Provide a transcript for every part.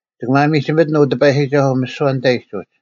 ᒋᑭ ᒪᒥᒋᒥᑎᓐ, ᐅ ᑎᐸᔨᒋᒐᓱᐤ, ᒥᓯᐛ ᓂᑕᐃᒡ ᐅᒡ;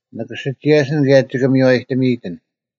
ᓂᑭ ᓯᒋᔭᓯᓐ ᑭᔭ ᒋᑭ ᒥᔽᔨᑎᒥᔨᑎᓐ: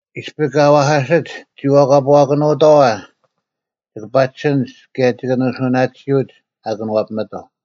ᐃᔅᐱ ᑲ ᐛᐧᑲᓯᒡ, ᒋᐛᑲᐳᐛᑭᓄᑥᐛ, ᒋᑭ ᐸᒋᓯᓐᒡ ᑭᔭ ᒋᑭ ᓂᓱᐅᓇᑎᓯᐅᒡ ᐊ ᑭᓄᐛᐱᒥᑥᐤ᙮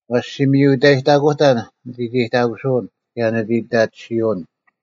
ᐛᔅ ᔅᒋ ᒥᔪ ᐃᑕᔨᑕᑯᑕᓐ ᓂᑦ ᐃᑕᔨᑕᑯᓱᐅᓐ ᑭᔭ ᓂᑦ ᐃᑕᑎᓯᐅᓐ;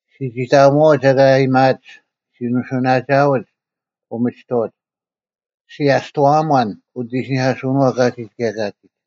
ᔅᒋ ᒋᑕᐊᒧᐛᐅᒡ ᐊᑲ ᐊᔭᒥᐊᒡ, ᔅᒋ ᓂᓱᐅᓇᒋᐊᐅᒡ ᐅᒥᒋᑥᐅᒡ, ᔅᒋ ᐊᔅᑐᐛᐊᒺᓐ ᐅᑦ ᐃᓯᓂᐧᑲᓱᐅᓄᐛᐤ ᑲᒋᒡ ᑭᔭ ᑲᒋᒡ᙮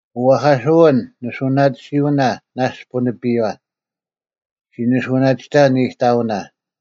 ᐅᐛᐧᑲᓱᐛᐎᓐ, ᓂᓱᐅᓇᑎᓯᐅᓇ ᓇᔅᒡ ᐳᓂᐱᔪᐛ: ᔅᒋ ᓂᓱᐅᓇᒋᑕᓐ ᐃᑕᐅᓇ;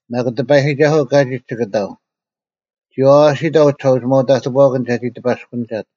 ᒪᒃ ᑎᐸᔨᒋᒐᓱᐤ ᑲᒋᒡ ᒋᑭ ᑕᐤ: ᒋ ᐛᐛᓯᑕᐤ ᐅᒋᓴᐅᒋᒪᐤ ᑕᑎᐳᐛᑭᓐ ᒐᒋ ᑎᐸᔅᑯᓂᒐᑦ: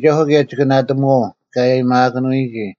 ᑎᐸᔨᒋᒐᓱᐤ ᑭᔭ ᒋᑭ ᓇᑎᒧᐛᐤ ᑲ ᐊᔨᒥᐊᑭᓄᔨᒋ,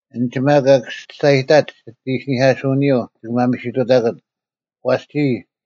ᐊᓐᒡ ᒪᒃ ᑲ ᒋᔅᒐᔨᑕᒡ ᒋᑦ ᐃᓯᓂᐧᑲᓱᐅᓂᔪᐤ ᒋᑭ ᒪᒥᓯᑐᑕᑯᒡ᙮ ᐛᔅ ᒋᔾ,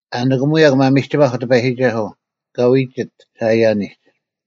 ᐊ ᓂᑭᒧᔭᒄ ᒪᒥᒋᒪᐧᒄ ᑎᐸᔨᒋᒐᓱᐤ, ᑲ ᐎᒋᑦ ᓴᐃᔭᓂᒡ: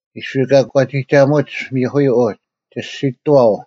ᐃᔅᐱ ᒂᒂᒋᒐᒧᒡ ᒥᐧᑯᔪᐤ ᐅᒡ, ᒋᔅᒋᑐᐛᐤ: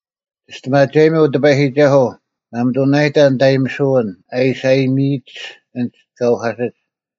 ᒋᔅᑎᒪᒐᔨᒥ, ᐅ ᑎᐸᔨᒋᒐᓱᐤ; ᒪᒥᑐᓇᔨᑕ ᓂᑦ ᐊᔨᒥᓯᐅᓐ ᐊ ᐃᓯ ᐊᔨᒥᐃᒡ ᐊᓐᒡ ᑲ ᐅᐧᑲᓯᒡ,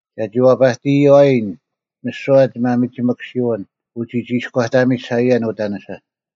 ᒐᒋ ᐛᐸᑎᔨᐛᔭᓐ ᒥᓯᐛ ᒋᒪᒥᒋᒥᑯᓯᐎᓐ ᐅᒋᒋᐃᔎᑕᒥᒡ ᓴᐃᔭᓐ ᐅᑕᓂᓴ: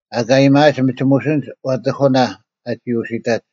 ᐊᑲ ᐊᔭᒥᐊᒡ ᒥᒋᒧᓯᓐᒡ ᐛᑎᑯᓇ ᐊᒋ ᐅᓯᑕᒡ: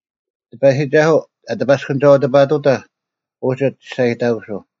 ᑎᐸᔨᒋᒐᓱᐤ ᐊ ᑎᐸᔅᑯᓂᒐᐤ ᑎᐱᑐᑕᐧᒃ ᐅᒋ ᒋᔅᒐᔨᑕᑯᓱᐤ: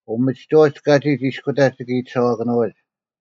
ᐅᒥᒋᑥᐅᒡ ᑲᒋᒡ ᐃᔅᑯᑕᒡ ᒋᑭ ᐃᑎᓴᐛᑭᓄᐎᒡ,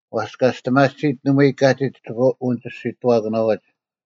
ᐛᔅ ᑲᒋᔅᑎᒪᑎᓯᒡ ᓇᒪᐎᔾ ᑲᒋᒡ ᒋᑭ ᐅᓂᒋᔅᒋᓯᑐᐛᑭᓄᐎᒡ: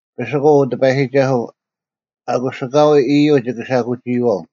ᐱᓯᑯᐤ, ᐅ ᑎᐸᔨᒋᒐᓱᐤ; ᐊᑯᔅ ᐊᑲᐎᔾ ᐃᔪᐤ ᒋᑭ ᓴᐧᑯᒋᐃᐛᐤ: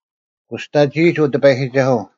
ᑯᔅᑕᒋᐃᒡ, ᐅ ᑎᐸᔨᒋᒐᓱᐤ;